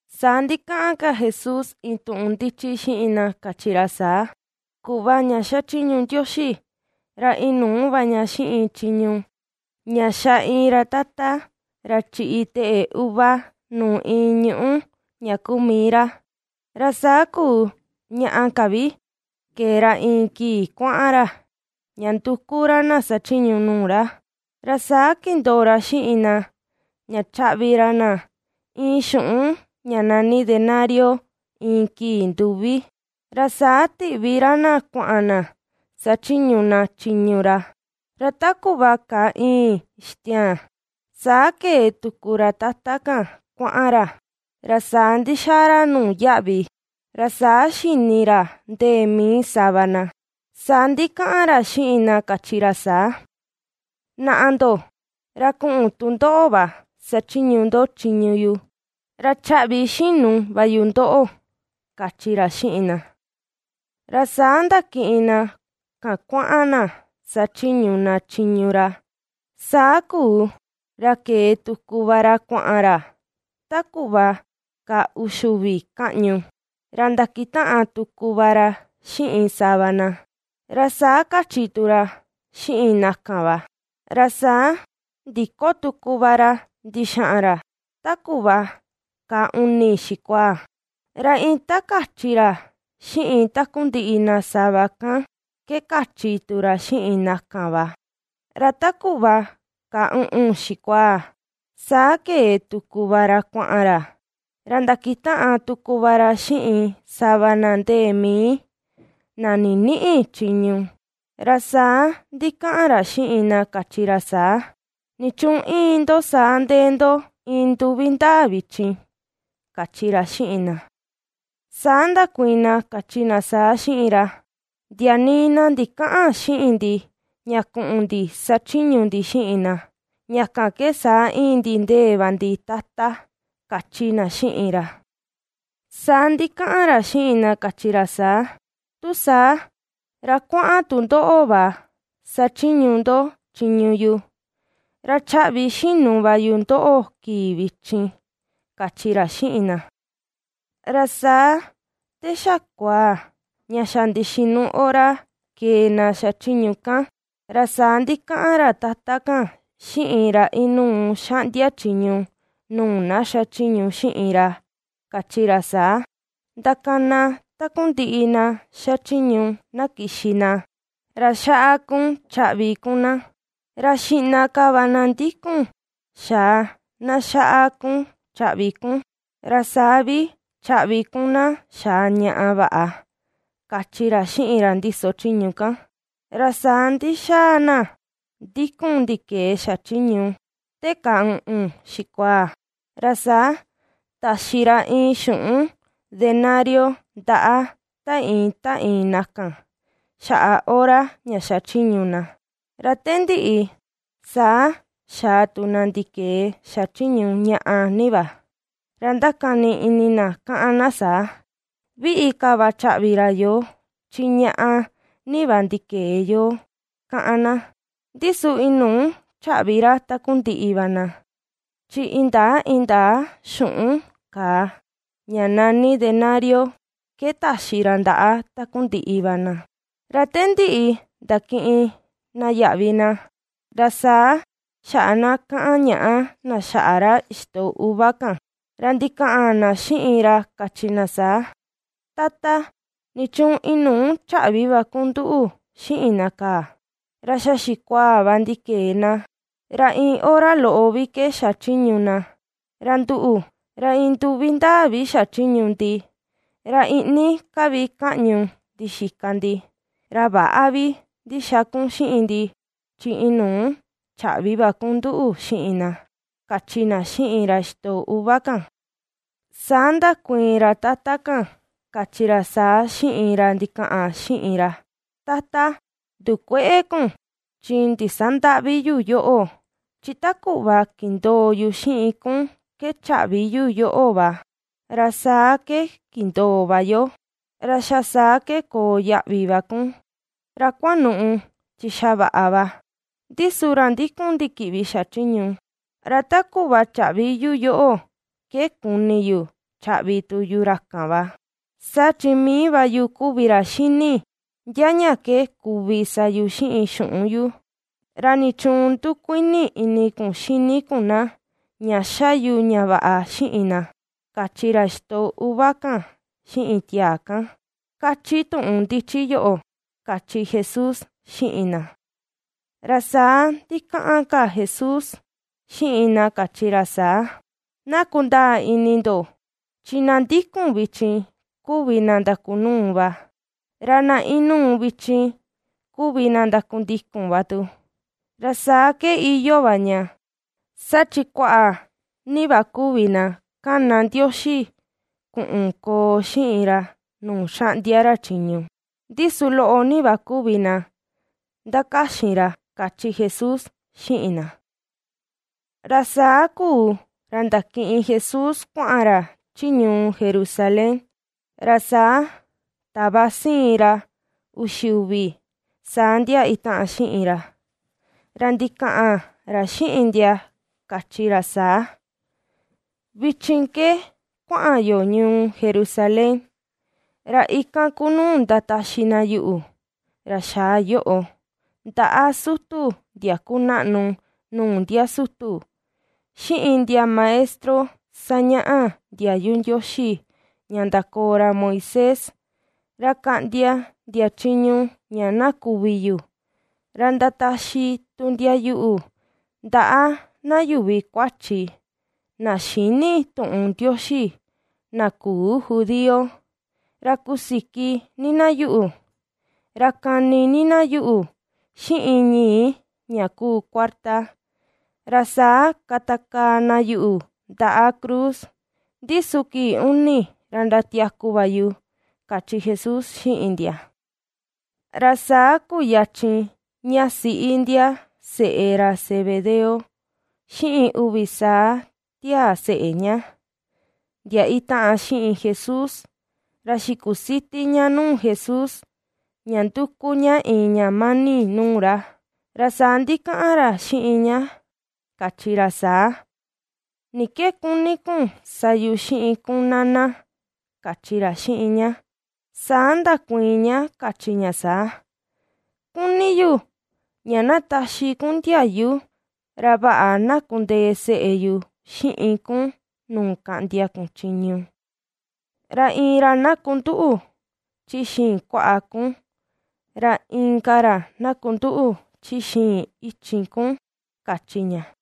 Saa ndikaꞌan ka Jesús iin tuꞌun ndichi xiꞌin na kachi ra saa: ―Kuꞌva ña xachiñu Ndioxi ra inuu va ña xiꞌin chiñu ña xa iin ra tata, ra chiꞌi teꞌe uva nuu iin ñuꞌu ña kuu mii ra, ra saa kuu ñaꞌa ka vi kee ra iin kii kuaꞌan ra, ña nduku ra na sachiñu nuu ra. Ra saa kindoo ra xiꞌin na ña chaꞌvi ra na iin xuꞌun ña nani denario iin kii nduvi, ra saa tiꞌvi ra na kuaꞌan na sachiñu na chiñu ra. Ra ta kuꞌva kaa ìi̱n ixtiaan, saa kee tuku ra tata kan kuaꞌan ra, ra saa ndixaa ra nuu yaꞌvi, ra saa xini ra ndee mii sava na. Saa ndikaꞌan ra xiꞌin na kachi ra saa: “Naꞌa ndo, ra kuꞌun tu ndoꞌo va sachiñu ndo chiñu yu, ra chaꞌvi xinu va yu ndoꞌo”, kachi ra xiꞌin na. Ra saa ndakiꞌin na kan kuaꞌan na sachiñu na chiñu ra. Saa kuu, ra kee tuku va ra kuaꞌan ra ta kuꞌva kaa uxi uvi kaꞌñu, ra ndakitaꞌan tuku va ra xiꞌin sava na; ra saa kachi tu ra xiꞌin na kan va. Ra saa ndiko tuku va ra ndixaꞌan ra ta kuꞌva ka uni xikuaa, ra iin ta kachi ra xiꞌin takundiꞌi na sava kan ke kachi tu ra xiꞌin na kan va. Ra ta kuꞌva ka uꞌun xikuaa, saa kee tuku va ra kuaꞌan ra, ra ndakitaꞌan tuku va ra xiꞌin sava na ndee mii, na ninïꞌi chiñu, ra saa ndikaꞌan ra xiꞌin na kachi ra saa: “¿Nichuun íin ndo saa ndee ndo iin nduvi ndaa vichin?”, kachi ra xiꞌin na. Saa ndakuiin na kachi na saa xiꞌin ra: “Ndia nii na ndikäꞌan xiꞌin ndi ña kuꞌun ndi sachiñu ndi xiꞌin na, ña kan ke saa íin ndi ndee va ndi, Tata”, kachi na xiꞌin ra. Saa ndikaꞌan ra xiꞌin na kachi ra saa: “Tu saa, ra kuaꞌan tu ndoꞌo va sachiñu ndo chiñu yu, ra chaꞌvi xinu va yu ndoꞌo kii vichin”, kachi ra xiꞌin na. ’Ra saa te xa kuaa ña xa ndixinu hora kee na xachiñu kan, ra saa ndikaꞌan ra tata kan xiꞌin ra inuu xaꞌndia chiñu nuu na xachiñu xiꞌin ra, kachi ra saa: “Ndakana takundiꞌi na xachiñu, na kixi na, ra xaꞌa kun chaꞌvi kun na, ra xiꞌna ka va na ndikun xaa na xaꞌa kun chaꞌvi kun, ra saa vi chaꞌvi kun na xaa ñaꞌa vaꞌa”, kachi ra xiꞌin ra ndiso chiñu kan. Ra saa ndixaa na ndikun ndikee xachiñu, te kàà uꞌun xikuaa, ra saa taxi ra iin xuꞌun denario ndaꞌa ta iin ta iin na kan, xaꞌa hora ña xachiñu na. Ra te ndiꞌi, saa xaa tu na ndikee xachiñu ñaꞌa ni va, ra ndakani ini na kaꞌan na saa: “Viꞌi ka va chaꞌvi ra yoo chi ñaꞌa ni va ndikee yo”, kaꞌan na, ndi su inuu chaꞌvi ra ta kundiꞌi va na, chi indaa indaa xuꞌun kàà ña nani denario ke taxi ra ndaꞌa takundiꞌi va na. Ra te ndiꞌi ndakiꞌin na yaꞌvi na, ra saa xaꞌa na kaꞌan ñàꞌa na xaꞌa ra ixtoꞌo uva kan, ra ndikaꞌan na xiꞌin ra kachi na saa: “Tata, nichuun inuu chaꞌvi va kun nduꞌu xiꞌin na kaa, ra xa xikuaa va ndikee na, ra iin hora loꞌo vi ke xachiñu na, ra nduꞌu, ra iin nduvi ndaa vi xachiñu ndi, ra iꞌni ka vi kaꞌñu ndixika ndi, ra väꞌa vi ndixa kun xiꞌin ndi, chi inuu chaꞌvi va kun nduꞌu xiꞌin na”, kachi na xiꞌin ra ixtoꞌo uva kan. Saa ndakuiin ra Tata kan kachi ra saa xiꞌin ra ndikaꞌan xiꞌin ra: “Tata, ndukuëꞌe kun chi ndisandäꞌvi yu yoꞌo, chi ta kuꞌva kindoo yu xiꞌin kun ke chaꞌvi yu yoꞌo va, ra saa ke kindoo va yo. Ra xa saa ke koo yaꞌvi va kun, ra kuanuꞌu chi xa vaꞌa va. Ndi su ra ndikun ndikiꞌvi xachiñu, ra ta kuꞌva chaꞌvi yu yoꞌo ke, kuni yu chaꞌvi tu yu ra kan va. Saa chi mii va yu kuvi ra xini, ndia ña ke kuvi sa yu xiꞌin xuꞌun yu. ¿Ra nichuun ndukuini ini kun xini kun na ña ^xa yu ña vaꞌa xiꞌin na?”, kachi ra ixtoꞌo uva kan xiꞌin tiaa kan, ^kachi tuꞌun ndichi yoꞌo ―kachi Jesús xiꞌin na. Ra saa ndikaꞌan ka Jesús xiꞌin na kachi ra saa: ―Na kundaa ini ndo, chi na ndikun vichin kuvi na ndakunuu va, ra na inuu vichin kuvi na ndakundikun va tu. Ra saa ke iyoo va ña: saa chi kuaꞌa ni va kuvi na ^kana Ndioxi kuꞌun koo xiꞌin ra nuu xaꞌndia ra chiñu, ndi su loꞌo ni va kuvi na ^ndakaxin ra ―kachi Jesús xiꞌin na. Ra saa kuu ra ndakiꞌin Jesús kuaꞌan ra chi ñuu Jerusalén, ra saa tava siin ra uxi uvi saa ndia itaꞌan xiꞌin ra, ra ndikaꞌan ra xiꞌin ndia kachi ra saa: ―Vichin ke kuaꞌan yo ñuu Jerusalén, ra ikan ku nuu ndataxi na yuꞌu, ra xaa yoꞌo, ndaꞌa sutu ndia kunaꞌnu nuu ndia sutu, xiꞌin ndia maestro sañaꞌa ndiayu Ndioxi ña ndakoo ra Moisés, ra kaꞌndia ndia chiñu ña na kuvi yu, ra ndataxi tu ndia yuꞌu ndaꞌa na yuvi kuachi na xïni tuꞌun Ndioxi, na küu judío, ra kusiki ni na yuꞌu, ra kani ni na yuꞌu xiꞌin ñii ña kuu kuarta, ra saa katakaa na yuꞌu ndaꞌa cruz, ndi su kii uni ra ndatiaku va yu ―kachi Jesús xiꞌin ndia. Ra saa kuyachin ña siꞌi ndia seꞌe ra Zebedeo xiꞌin uvi saa tiaa seꞌe ña, ndia itaꞌan xiꞌin Jesús, ra xikusiti ña nuu Jesús; ña ^nduku ña iin ña mani nuu ra. Ra saa ndikaꞌan ra xiꞌin ña kachi ra saa: ―¿Ni ke kuni kun sa yu xiꞌin kun, Nana? ―kachi ra xiꞌin ña. Saa ndakuiin ña kachi ña saa: ―Kuni yu ña na taxi kun ndiayu ra vaꞌa na kundee seꞌe yu xiꞌin kun nuu kaꞌndia kun chiñu; ra iin ra na kunduꞌu chi xiin kuaꞌa kun, ra inka ra na kunduꞌu chi xiin ichin kun ―kachi ña.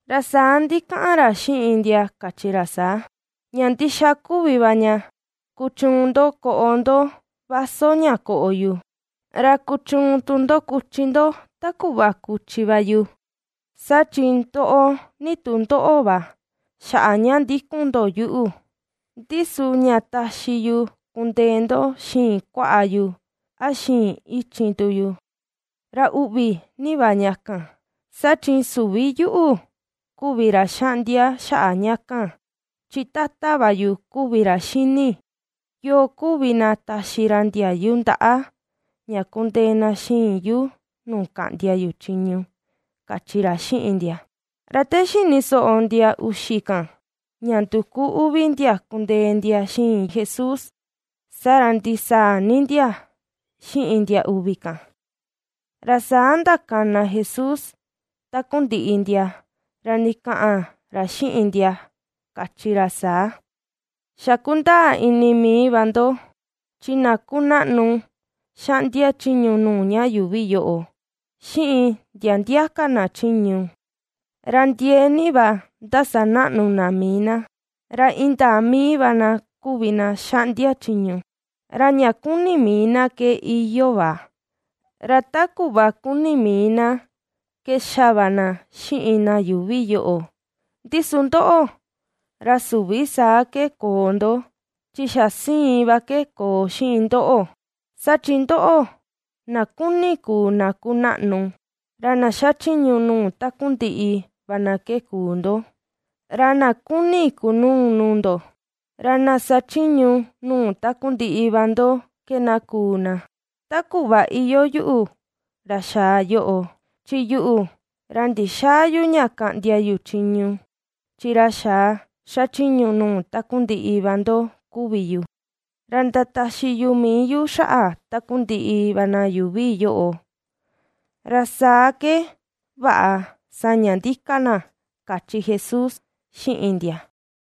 Ra saa ndikaꞌan ra xiꞌin ndia kachi ra saa: ―Ña ndixa kuvi va ña kuchuun ndo koꞌo ndo vaso ña koꞌo yu, ra kuchuun tu ndo kuchi ndo ta kuꞌva kuchi yu; saa chi ndoꞌo ni tu ndoꞌo va xaꞌa ña ndikun ndo yuꞌu. Ndi su ña taxi yu kundee ndo xiin kuaꞌa yu, a xiin ichin tu yu, ra uꞌvi ni va ña kan, saa chin süvi yuꞌu kuvi ra xaꞌndia xaꞌa ña kan, chi Tata va yu kuvi ra xini, yoo kuvi na taxi ra ndiayu ndaꞌa ña kundee na xiin yu nuu kaꞌndia yu chiñu ―kachi ra xiꞌin ndia. Ra te xini soꞌo ndia uxi kan, ña nduku uvi ndia kundee ndia xiin Jesús, saa ra ndisaa ni ndia xiꞌin ndia uvi kan. Ra saa ndakana Jesús takundiꞌi ndia, ra ndikaꞌan ra xiꞌin ndia kachi ra saa: ―Xa kundaa ini mii va ndo chi na kunaꞌnu xaꞌndia chiñu nuu ña yuuvi yoꞌo, xiꞌin ndia ndia ka na chiñu, ra ndiee ni va ndasanaꞌnu na mii na, ra indaa mii va na kuvi na xaꞌndia chiñu, ra ña kuni mii na ke iyoo va, ra ta kuꞌva kuni mii na ke ^xa va na xiꞌin na yuuvi yoꞌo. Ndi su ndoꞌo, ra süvi saa ke koo ndo, chi xa siin va ke koo xiꞌin ndoꞌo. Saa chi ndoꞌo, na ^kuni kuu na kunaꞌnu, ra na xachiñu nuu takundiꞌi va na ke kuu ndo. Ra na ^kuni kunuu nuu ndo, ra na sachiñu nuu takundiꞌi va ndo ke na kuu na. Ta kuꞌva iyoo yuꞌu, ra xaa yoꞌo, chi yuꞌu ra ndixäa yu ña kaꞌndia yu chiñu, chi ra xaa xachiñu nuu takundiꞌi va ndo kuvi yu, ra ndataxi yu mii yu xaꞌa takundiꞌi va na yuuvi yoꞌo, ra saa ke vaꞌa saña ndika na ―kachi Jesús xiꞌin ndia.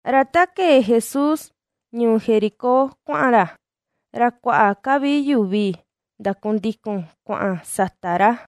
Ra ta kee Jesús ñuu Jericó kuaꞌan ra, ra kuaꞌa ka vi yuvi ndandikun kuaꞌan sata ra.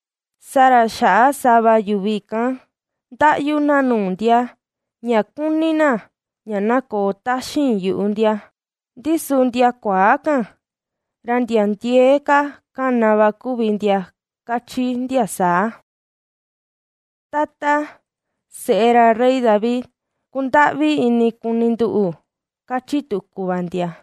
Saa ra xaꞌa sava yuvi kan ndaꞌyu na nuu ndia, ña kuni na, ña na koo taxin yuꞌu ndia; ndi su ndia kuaa kan ra ndia ndiee ka kana va kuvi ndia kachi ndia saa: ―¡Tata, seꞌe ra rey David, kundaꞌvi ini kuni nduꞌu! ―kachi tuku va ndia.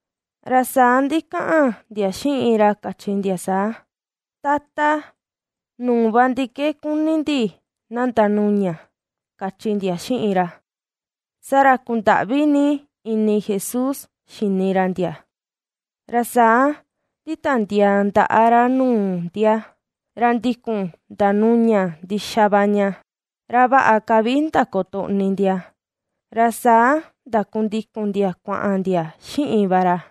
Ra saa ndikaꞌan ndia xiꞌin ra kachi ndia saa: ―Tata, nuu va ndi ke kuni ndi na ndanuña ―kachi ndia xiꞌin ra. Saa ra kundaꞌvi ni ini Jesús xini ra ndia, ra saa nditiandiaa ndaꞌa ra nuu ndia, ra ndikun ndanuña ndixa va ña, ra vaꞌa ka vi ndakotoꞌni ndia. Ra saa ndakundikun ndia kuaꞌan ndia xiꞌin va ra.